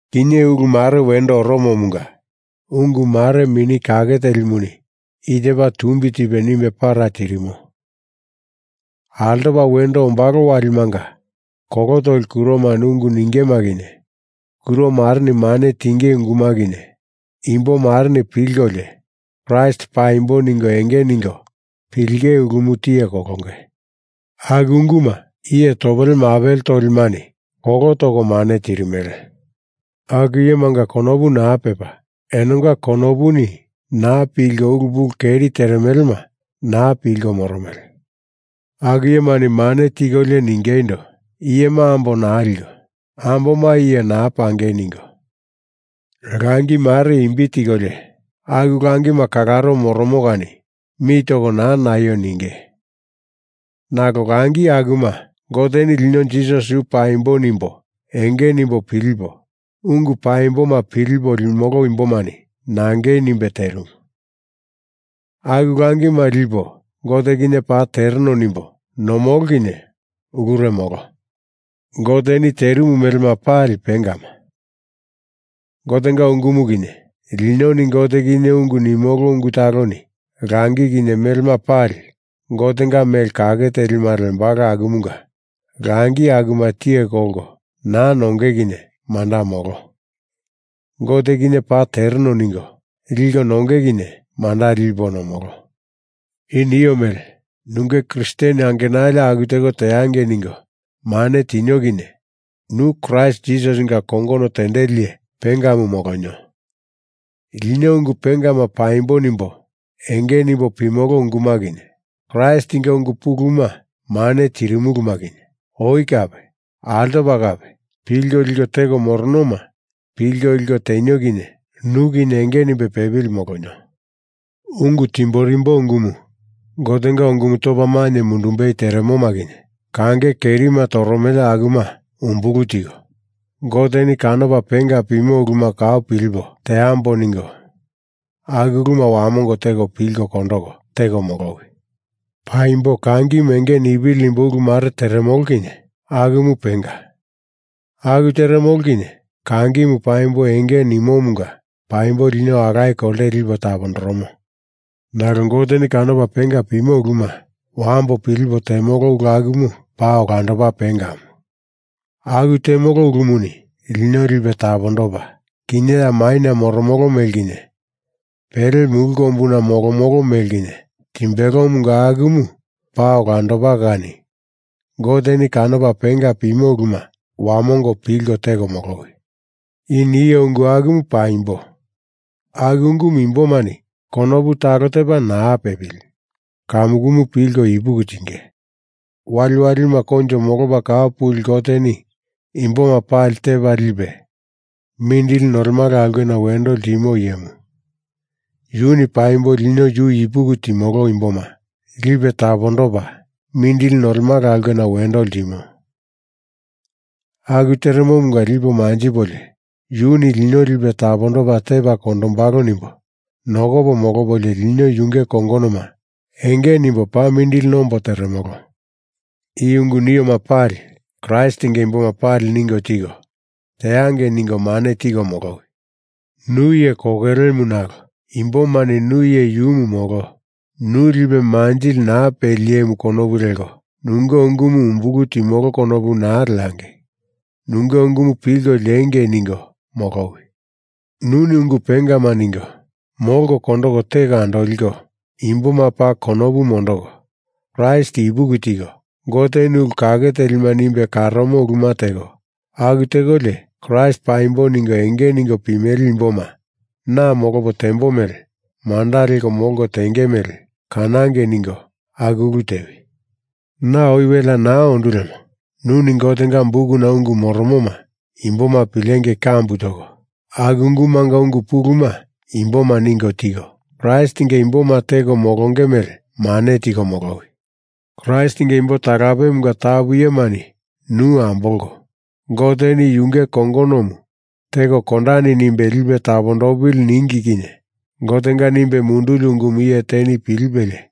Kinye ulu mare wendo oromomunga ungu mare Mini Kake Telimuni i tepa tumbi tipe nimbe para tirimo. Altopa wendo ombalo walimanga kolo toli kuromani ungu ningema kinye, kuro mareni mane tinge unguma kinye, imbo mareni pilkolio Kraist paimbo ningo enge ningo pilinge ulumu tiye kolonge. Aku unguma iye topele mapele tolimani kolo toko mane tirimele. Aku iyemanga konopu naa pepa, enonga konopuni naa pilko ulu pulu keri teremelema naa pilko moromele. Aku iyemani mane tikolio ningeindo, iyema ambo naa liko amboma iye naa pangei ningo, langi mare imbi tikolio aku langima kalaro moromo kani mi toko naa naio ninge. Nalo langi akuma Goteni lino Jisasi yu paimbo nimbo enge nimbo pilipo, ungu paimboma pilipo limolo imbomani nangei nimbe terimu. Aku langima lipo Gote kinye paa tereno nimbo nomolo kinye ulure molo. Goteni terimu melema pali pengama. Gotenga ungumu kinye linoni Gote kinye ungu nimolo ungu taloni langi kinye melema pali Gotenga mele kake telima lembalo akumunga langi akuma tiye kolko naa nonge kinye manda molo. Gote kinye paa tereno ningo liko nonge kinye manda lipo nomolo. I nio mele nunge Kristen angenali aku teko teangei ningo mane tinio kinye nu Kraist Jisasinga kongono tendeli iye pengamu molonio. Lino ungu pengama paimbo nimbo enge nimbo pimolo unguma kinye Kraistinga ungu puluma mane tirimuluma kinye oi kape altopa kape pilko liko teko moronoma pilko liko tenio kinye nu kinye enge nimbe pepili molonio. Ungu timborimbo ungumu Gotenga ungumu topa mainye mundumbei teremoma kinye kange kerima toromele akuma umbulu tiko, Goteni kanopa penga pimo uluma kau pilipo teambo ningo aku uluma wamongo teko pilko kondoko teko molowi. Paimbo kangimu enge nipili nimbo ulu mare teremolo kinye akumu penga. Aku teremolo kinye kangimu paimbo enge nimomunga paimbo lino alaye kolte lipe tapondoromo. Nalo Goteni kanopa penga pimo uluma wambo pilipo temolo ulu akumu paa olandopa pengamu. Aku temolo ulumuni lino lipe tapondopa, kinye ya maina moromolo mele kinye pele mulu kombuna molomolo mele kinye timbelomunga akumu paa olandopa kani Goteni kanopa penga pimo uluma wamongo pilko teko molowi. I nio ungu akumu paimbo. Aku ungumu imbomani konopu talo tepa naa pepili kamukumu pilko ipuki tinge. Waliwalima koinjo molopa kau puli Goteni imboma pali Tepa Lipe Mindili Nolemala Aulkena Wendo Ltimo Iyemu yuni paimbo lino yu ipuki timolo imboma lipe tapondopa mindili nolemala aulkena wendo ltimo. Aku teremomunga lipo manjipolio, Yuni lino lipe tapondopa tepa kondombalo nimbo nokopo molopolio lino yunge kongonoma enge nimbo paa mindili nombo teremolo. I ungu nioma pali Kraistinga imboma pali ningo tiko, teangei ningo mane tiko molowi. Nu iye kokelemu, nalo imbomani nu iye yumu molo, nu lipe manjili naa peli iyemu konopu leko nunge ungumu umbulu timolo konopu naa leangei. Nunge ungumu pilko liengei ningo molowi. Nuni ungu pengama ningo, molko kondoko teko andoliko, imboma paa konopu mondoko, Kraist ipuki tiko, Goteni ulu kake telima nimbe karomo uluma teko, aku tekolio Kraist paimbo ningo enge ningo pimele imboma na molopo tembo mele manda leko molko tenge mele kanangei ningo aku ulu tewi. Na oi welea naa ondu lemo, nuni Gotenga bukuna ungu moromoma imboma pilengei kambu toko, aku ungumanga ungu puluma imboma ningo tiko, Kraistinga imboma teko molonge mele mane tiko molowi. Kraistinga imbo talapemunga tapu iyemani nu ambolko Goteni yunge kongonomu teko kondani nimbe lipe tapondopili ningi kinye Gotenga nimbe munduli ungumu iye teni pilipelie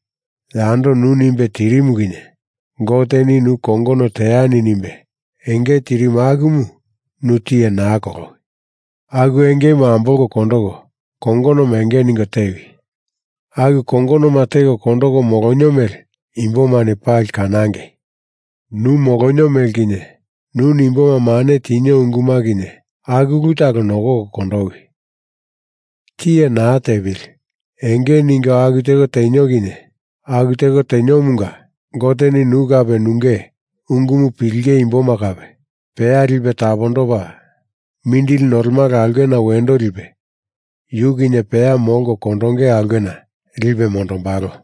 yando nu nimbe tirimu kinye Goteni nu kongono teani nimbe enge tirimu akumu nu tiye naa kolowi. Aku engemu ambolko kondoko kongonoma enge ningo tewi. Aku kongonoma teko kondoko molonio mele imbomani pali kanangei. Nu molonio mele kinye, nuni imboma mane tinio unguma kinye, aku ulu talo nokoko kondowi. Tiye naa tepili enge ningo aku teko tenio kinye aku teko teniomunga Goteni nu kape nunge ungumu pilinge imboma kape peya lipe tapondopa mindili nolemala aulkena wendo lipe yu kinye peya molko kondonge aulkena lipe mondombalo.